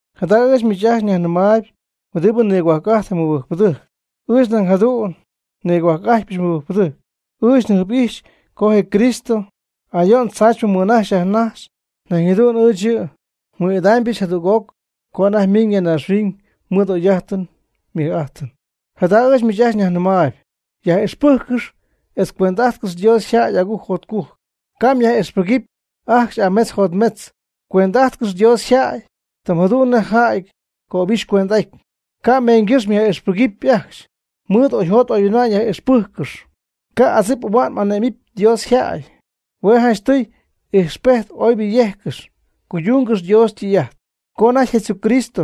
Jada ɨɨch miich ajcxy yajnɨmaayb huɨdibɨ nigohuajc'ajtp je mɨbɨjcpɨdɨjc, ɨɨch nañ jadu'n nigohuajc'ajtpyɨch mɨbɨjcpɨdɨjc. Ɨɨch n'ijxyɨch co je Cristo ayo'n tzaachypɨ mɨnajxy yajnajxy. Nañ jadu'n ɨɨch yɨ' nmɨɨd'idaamybɨch jadüg'oc co anajty ymiñ ya naaxhuiñ mɨɨd y'oy'ajtɨn ymɨj'ajtɨn. Jada ɨɨch miich ajcxy nyajnɨmaayb: yaj'ixpɨjccɨx etz cuend'ajtcɨx Dios yjäy agujc jotcujc. Ca' myaj'ixpɨgɨpy ajcxy ametz jotmetz, cuend'ajtcɨx Dios yjäy, tɨm jadu'n nej jäy ycöbixy cuend'aty. Ca' meeñgɨ́xy myaj'ixpɨgɨpy ajcxy. Mɨɨd oyjot oyhuinma'ñ myaj'ixpɨjccɨxy. Ca' adzip ahua'n m'ane'mɨpy Dios yjäy. Hue' janchtɨy ijxpejt oybɨ yejccɨx. Cuydungɨx Dios ytɨy'ajt. Co anajty Jesucristo,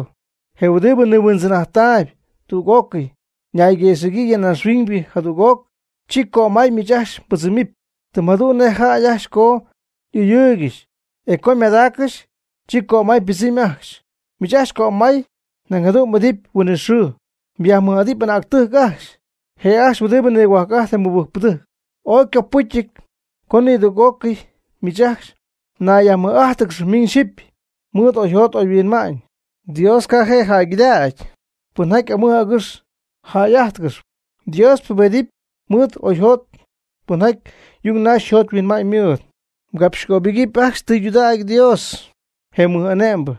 je huɨdibɨ nihuindzɨn'ajttaayb tüg'ócɨy, ñayguëxɨ̈gyii ya naaxhuiñ jadüg'oc, chi cömay miich ajcxy mbɨdzɨmɨpy. Tɨm jadu'n nej jäy ajcxy co y'ɨyɨɨygɨxy e co ymadaaccɨxy, chi cömay ypɨdzɨm ajcxy. Miich ajcxy cömay nañ jadu'n m'idɨpy huinɨxɨɨ. Myajmɨj'adɨpy anäctɨjc ajcxy, je' ajcxy huɨdibɨ nigohuajc'ajtp je mɨbɨjcpɨdɨjc. Ooy ycopɨcyɨty co nidüg'ócɨy miich ajcxy mnayyajmɨj'ájtɨgɨxɨpy miñ xyɨpy mɨɨd oyjot oyhuinma'ñ. “Dios ca' je' jäygɨdägy pɨnjaty amɨj agɨx jäy'ájtɨgɨxy. Dios ypubejtyp mɨɨd y'oyjot pɨnjaty yung naxy yjot yhuinma'ñ mɨɨd.” Mgapxcöbɨgɨpy ajcxy tɨydudägy Dios, je mɨj'ane'mbɨ,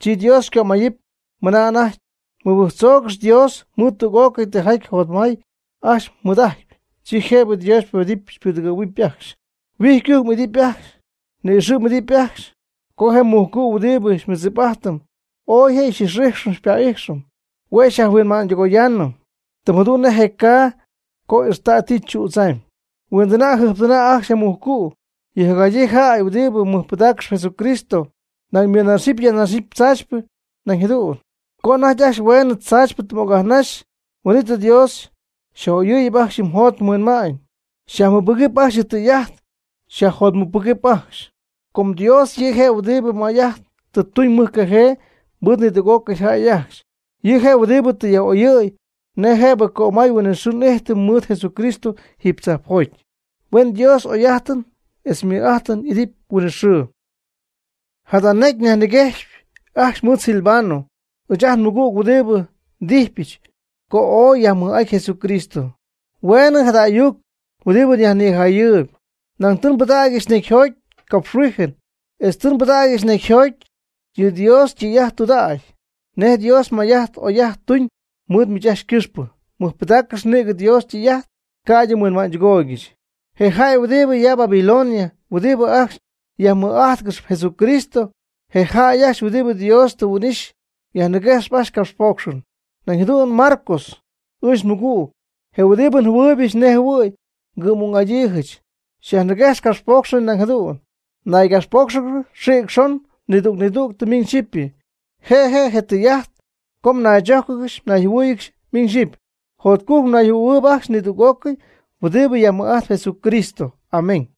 chi Dios xycömayɨpy mɨna anajty. Mɨbɨjctzougɨx Dios mɨɨd tüg'ócɨy tijaty jotmay ajcxy mɨɨd'ajtyp, chi jëbɨ Dios xypubedɨpy xypudɨgɨ̈huɨpy ajcxy. Huijycujc m'idɨpy ajcxy. Nïxɨ' m'idɨpy ajcxy. Com je mujcu' huɨdibɨ xymɨɨdzip'ajtɨm, ooy je' xy'ix'ijxɨm xypa'ijxɨm. Hue' xyajhuinma'ñydɨgoyaanɨm, tɨm jadu'n nej je caa co ixtay ti chüdzaamyb. Huindɨna' jɨjptɨna' ajcxy je mujcu'. Yɨ jacjadyii jäy huɨdibɨ mɨjpɨdaaccɨxy Jesucristo, nañ ymɨnajxcɨxyp yajnajxcɨxyp tzaachypɨ nañ jadu'n. Co anajty ajcxy hueenɨ tzaachypɨ tɨ m'ocyajnaxy, huin'it Dios xyaj'oyɨɨyɨpy ajcxy yɨ mjot yɨ mhuinma'ñ, xyajmɨbɨgɨp ajcxy yɨ' ytɨy'ajt, xyajjotmɨcpɨgɨp ajcxy. Com Dios yɨ' je' huɨdibɨ may'ajt tɨ tuñ mɨjcajee mɨɨd nidüg'ócɨy jäy ajcxy. Yɨ' je' huɨdibɨ tɨ yaj'oyɨ̈y nej jëbɨ cömay huinɨxɨɨ n'ijtɨm mɨɨd Jesucristo jiiby tzajpjoty. Huen Dios y'oy'ajtɨn etz ymɨj'ajtɨn idɨpy huinɨxɨɨ. Jada necy nyajniguejxy ajcxy mɨɨd Silvano ɨɨch ajt nmɨgüg huɨdibɨ ndijpyɨch co ooy yajmɨj'aty Jesucristo. Hueenɨ jada ayuc huɨdibɨ nyajnijayɨɨyb, nañ tɨ nbɨdägyɨch necyjoty capxhuijɨn etz tɨ nbɨdägyɨch necyjoty yɨ Dios ytɨy'ajt tudägyp, nej Dios may'ajt oy'ajt tuuñ mɨɨd miich ajcxy ycɨxpɨ. Mɨjpɨdaaccɨx nïgɨ Dios ytɨy'ajt, ca'ydɨ mhuinma'ñydɨgooygɨxy. Je jäy huɨdibɨ ya Babilonia huɨdibɨ ajcxy yajmɨj 'ajtcɨxp Jesucristo, je jäy ajcxy huɨdibɨ Dios tɨ huin'ixy, xyajniguejxp ajcxy capxpoocxɨn. Nañ jadu'n Marcos ɨɨch nmɨgüg, je huɨdibɨ njɨhuɨɨybɨch nej jɨhuɨ̈y ngɨ'm'ung'adyiijɨch xyajniguejxp capxpoocxɨn nañ jadu'n. Naygapxpóocxɨgɨx xïc xon nidüg nidüg miñ xyɨpy. Je' je' je tɨy'ajt co mnaychójcɨgɨxy mnayjɨhuɨ́ɨyɨgɨxy miñ xyɨpy. Jotcujc mnayjɨhuɨ̈huɨɨyb ajcxy nidüg'ócɨy huɨdib yajmɨj'ajtp Jesucristo. Amén.